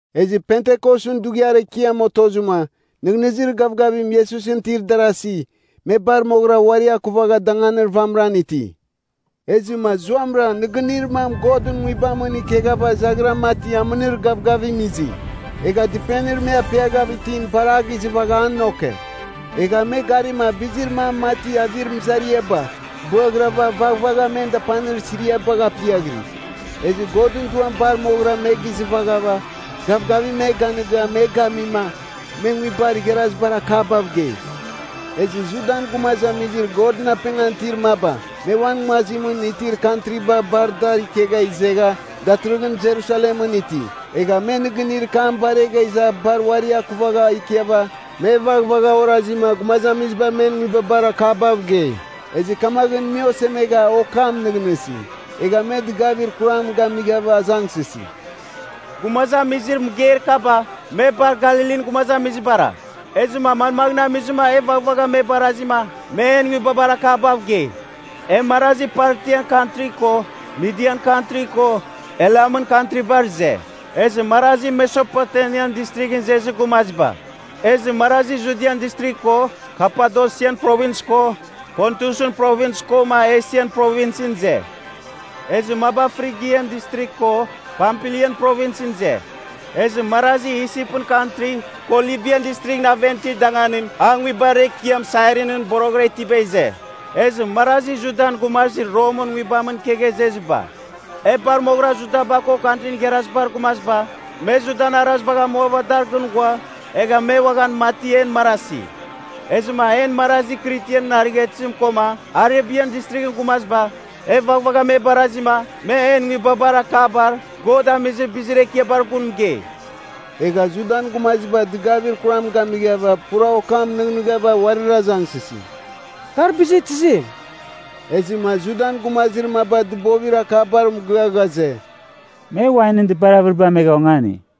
Ezɨ Pentikosɨn Dughiar Ekiam otozɨma, nɨghnɨzir gavgavim Iesusɨn itir darasi, me bar moghɨra uari akuvagha danganir vamɨran iti. Ezɨma zuamɨra nɨgɨnir mam Godɨn Nguibamɨn ikeghava zaghira mati amɨnir gavgavim izi. Egha dɨpenir me apiaghav itim bar a gizɨvagha a noke. Egha me garima bizir mam mati avir mɨzariaba bɨaghɨrava vaghvagha men dapanir siriabagh apiaghiri. Ezɨ Godɨn Duam bar moghɨra me gizɨvaghava, gavgavim me ganɨga me gamima, me nguibar igharazibar akabav gei. Ezɨ Judan gumazamizir Godɨn apengan itir maba, me uan nguazimɨn itir kantriba bar dar ikegha izegha datɨrɨghɨn Jerusalemɨn iti. Egha me nɨgɨnir kam baregha iza bar uari akuvaghav ikiava, me vaghvagha orazima gumazamiziba men nguibabar akabav gei. Ezɨ kamaghɨn me osemegha okam nɨghnɨsi. Egha me dɨgavir kuram gamighava azangsɨsi, “Gumazamizir mɨgeir kaba, me bar Galilin gumazamizibara! Ezɨma manmaghɨn amizima e vaghvagha me barazima me en nguibabar akabav gei? E marazi, Partian kantri ko Midian kantri ko Elamɨn kantribar ize. Ezɨ marazi Mesopotemian Distrighɨn izezir gumaziba. Ezɨ marazi Judian Distrigh ko Kapadosian Provins ko Pontusɨn Provins koma Esian Provinsɨn ize. Ezɨ maba Frigian Distrigh ko Pampilian Provinsɨn ize. Ezɨ marazi Isipɨn kantri, ko Libian Distrighɨn aven itir danganim a nguibar ekiam Sairinin boroghɨra itiba ize. Ezɨ marazi Judan gumazir Romɨn nguibamɨn ikegha izeziba. E bar moghɨra, Judaba ko Kantrin Igharazibar Gumaziba, me Judan arazibagh amuava dar gɨn ghua, egha me uaghan, mati en marasi. Ezɨma en marazi Kritian arighatɨzim koma Arebian Distrighɨn gumaziba, e vaghvagha me barazima me en nguibabar akabar God amizir bizir ekiabar gun mɨgei!” Egha Judan gumaziba dɨgavir kuram gamighava pura okam nɨghnɨghava uarir azangsɨsi, “Kar bizir tizim?” Ezɨma Judan gumazir maba dɨbovir akabar mɨgɨa ghaze, “Me wainɨn dɨpar avɨriba amegha ongani.”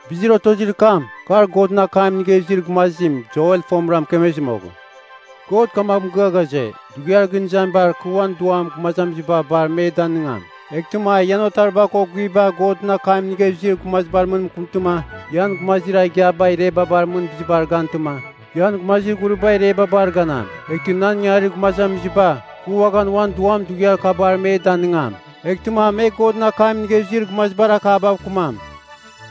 Bizir otozir kam, kar Godɨn akam inigha izir gumazim Joel fomɨra mɨkemezir moghɨn, ‘God kamaghɨn mɨgɨa ghaze, Dughiar gɨn izamibar kɨ uan Duam gumazamiziba bar me danɨngam. Eghtɨma ian otariba ko guiviba Godɨn akam inigha izir gumazibar mɨn mɨkɨmtɨma, ian gumazir igiaba irebabar mɨn bizibar gantɨma, ian gumazir ghuriba irebabar ganam. Eghtɨ nan ingangarir gumazamiziba, kɨ uaghan uan Duam dughiar kabar me danɨngam, eghtɨma me Godɨn akam inigha izir gumazibar akabav kɨmam.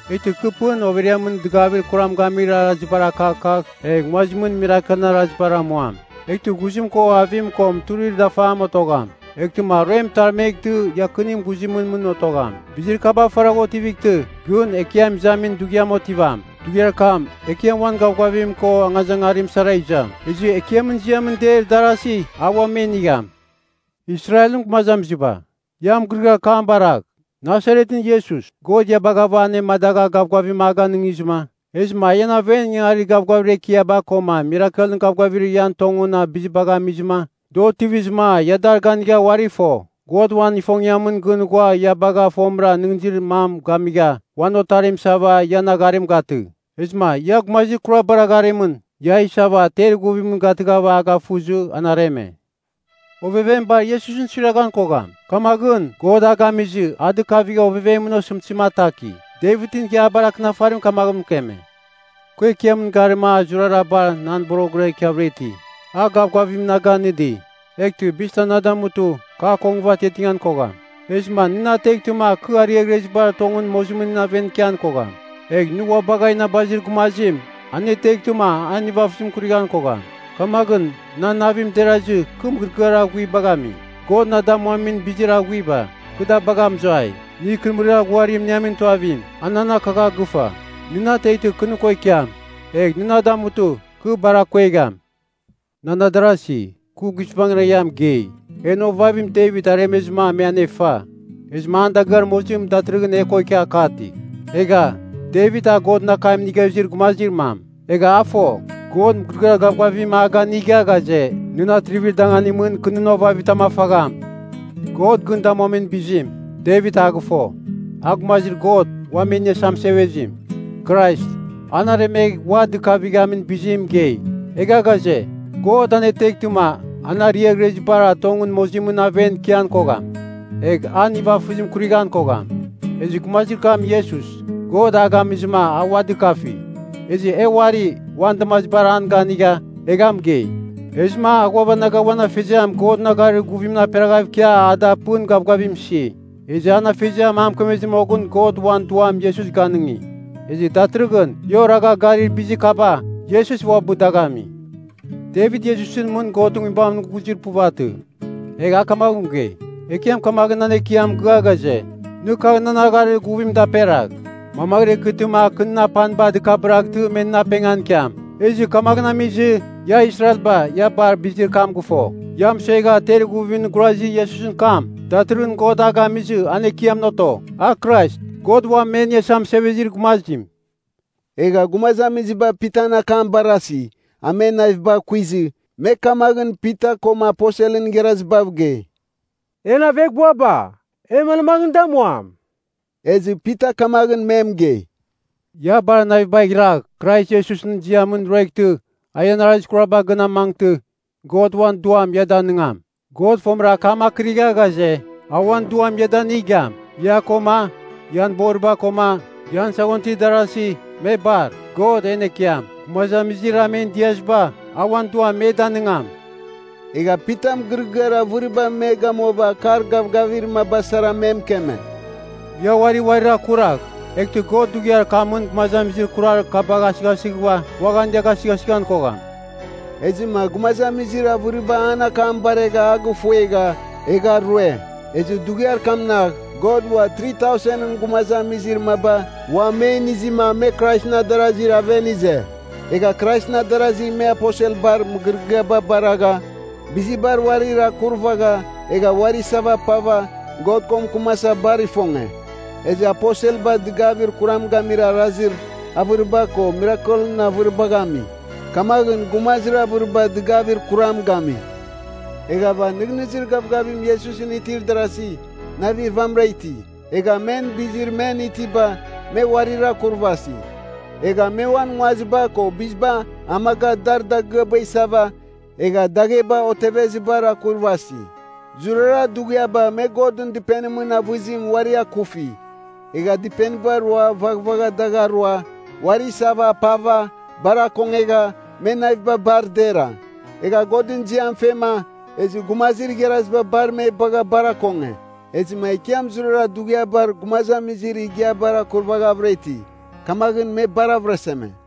Eghtɨ kɨ pɨn overiamɨn dɨgavir kuram gamir arazibar akakagh, egh nguazimɨn mirakelɨn arazibar amuam. Eghtɨ ghuzim ko avim ko muturir dafam otogham. Eghtɨma aruem mɨtarmeghtɨ, iakinim ghuzimɨn mɨn otogham. Bizir kaba faragh otivightɨ, gɨn Ekiam Izamin Dughiam otivam. Dughiar kam Ekiam uan gavgavim ko angazangarim sara izam. Ezɨ Ekiamɨn ziamɨn deir darasi, a ua me inigham.’ “Israelɨn gumazamiziba, ia mɨgɨrɨgɨar kam baragh. Nasaretɨn Iesus, God ia baghava anemadagha gavgavim a ganɨngizɨma, ezɨma a ian aven ingangarir gavgavir ekiaba koma mirakelɨn gavgavibar ian tongɨn bizibagh amizɨma, da otivizɨma ia dar ganigha uari fo. God uan ifongiamɨn gɨn ghua ia bagha fomɨra nɨghnɨzir mam gamigha, uan otarim isava ian agharim gatɨ. Ezɨma ia gumazir kurabar agharimɨn, ia a isava ter ighuvim gatɨghava a gafuzɨ, an areme. Ovevem bar Iesusɨn suiraghan kogham. Kamaghɨn, God a gamizɨ a dɨkavigha ovevemɨn osɨmtɨzim ataki. Devitɨn Ighiabar Akɨnafarim kamaghɨn mɨkeme, ‘Kɨ Ekiamɨn garima a zurara bar nan boroghɨn ikiavɨra iti. A gavgavim na ganɨdi. Eghtɨ bizitam na damutɨ, kɨ akongɨva atiatiatingan kogham. Ezɨma nɨ na ateghtɨma kɨ ariaghrezibar tongɨn mozimɨn aven ikian kogham. Egh nɨ ua bagha inabazir gumazim aneteghtɨma an nivafɨzim kurighan kogham. Kamaghɨn nan navim derazɨ kɨ mɨgɨrɨgɨar aghuibagh ami. God na damuamin bizir aghuiba, kɨ da bagha mɨzuai. Nɨ, ikɨrɨmɨrir aghuarim iniamin tuavim, a nan akagha gɨfa. Nɨ na ateghtɨ kɨ nɨ ko ikiam, egh nɨ na damutɨ, kɨ bar akuegham.’ “Nan adarasi, kɨ guizbangɨra ia mɨgei, en ovavim Devit aremezɨma me anefa. Ezɨma an dagɨar mozim datɨrɨghɨn e ko ikia kati. Egha, Devit a Godɨn akam inigha izir gumazir mam, egha a fo, God mɨgɨrɨgɨar gavgavim a ganiga ghaze, ‘Nɨn atrivir danganimɨn kɨ nɨn ovavitam afagham.’ God gɨn damuamin bizim, Devit a gɨfo, a Gumazir God Uam E Iniasa Mɨsevezim, Krais, an aremegh ua dɨkavamin bizim mɨgei. Egha ghaze, God aneteghtɨma an ariaghrezibar tongɨn mozimɨn aven ikian kogham. Egh an nivafɨzim kurighan kogham. Ezɨ gumazir kam Iesus, God a gamizɨma a ua dɨkafi. Ezɨ e uari uan damazibar an ganigha, egha mɨgei. Ezɨma a ghuavanaga uan Afeziam Godɨn agharir guvim gaperaghav ikia a da pɨn gavgavim isi. Ezɨ an Afeziam a mɨkemezir moghɨn God uan Duam Iesus ganɨngi. Ezɨ datɨrɨghɨn ia oragha garir bizir kaba, Iesus uabɨ dagh ami. Devit Iesusɨn mɨn Godɨn Nguibamɨn ghuzir puvatɨ. Egha a kamaghɨn mɨgei, ‘Ekiam kamaghɨn nan Ekiamɨn mɨgɨa ghaze, “Nɨ kagh nan agharir guvimɨn daperagh. Mamaghɨra ikɨtɨma kɨ nɨn apaniba dɨkabɨraghtɨ me nɨn apengan ikiam.” ’ “Ezɨ kamaghɨn amizɨ, ia Israelba ia bar bizir kam gɨfo, ia mɨsuegha ter ighuvimɨn gurazir Iesusɨn kam, datɨrɨghɨn God a gamizɨ an Ekiamɨn oto, a Krais, God Uam E Iniasa Mɨsevezir Gumazim.” Egha gumazamiziba Pitan akam barasi, a men navibagh kuizɨ, me kamaghɨn Pita koma aposelɨn igharazibav gei, “En aveghbuaba, e manmaghɨn damuam?” Ezɨ Pita kamaghɨn me mɨgei, “Ia bar navibagh iragh Krais Iesusɨn ziamɨn rueghtɨ a ian arazir kuraba gɨn amangtɨ, God uan Duam ia danɨngam. God fomɨra akam akɨrigha ghaze, a uan Duam ia danigam, ia koma, ian boriba koma, ian saghon itir darasi, me bar. God, en Ekiam, gumazamizir a men diaziba, a uan Duam me danɨngam.” Egha Pita mɨgɨrɨgɨar avɨribar me gamuava akar gavgavir maba sara me mɨkeme, “Ia uari uarir akuragh, eghtɨ God dughiar kamɨn gumazamizir kurar kabagh asɨghasɨghɨva uaghan ia gasɨgasɨghan kogham.” Ezɨma gumazamizir avɨriba an akam baregha a gifuegha, egha rue. Ezɨ dughiar kamnagh God ua 3,000ɨn gumazamizir maba ua me inizɨma me Kraisɨn adarazir aven ize. Egha Kraisɨn adarasi me aposelbar mɨgɨrɨgɨaba baragha, bizibar uarir akurvagha, egha uari isava apava, God ko mɨkɨmasa bar ifonge. Ezɨ aposelba dɨgavir kuram gamir arazir avɨriba ko mirakelɨn avɨribagh ami. Kamaghɨn gumazir avɨriba dɨgavir kuram gami. Eghava nɨghnɨzir gavgavim Iesusɨn itir darasi, navir vamɨra iti. Egha men bizir men itiba, me uarira akurvasi. Egha me uan nguaziba ko biziba amaga dar dagɨaba isava egha dagheba otevezibar akurvasi. Zurara dughiaba me Godɨn Dɨpenimɨn avɨzim uari akufi. Egha dɨpeniba roa vaghvagha dagh arua, uari isava apava, bar akongegha, men naviba bar dera. Egha Godɨn ziam fema, ezɨ gumazir igharaziba bar me bagha bar akonge. Ezɨma Ekiam zurara dughiabar gumazamizir igiabar akurvaghavɨra iti. Kamaghɨn me bar avɨraseme.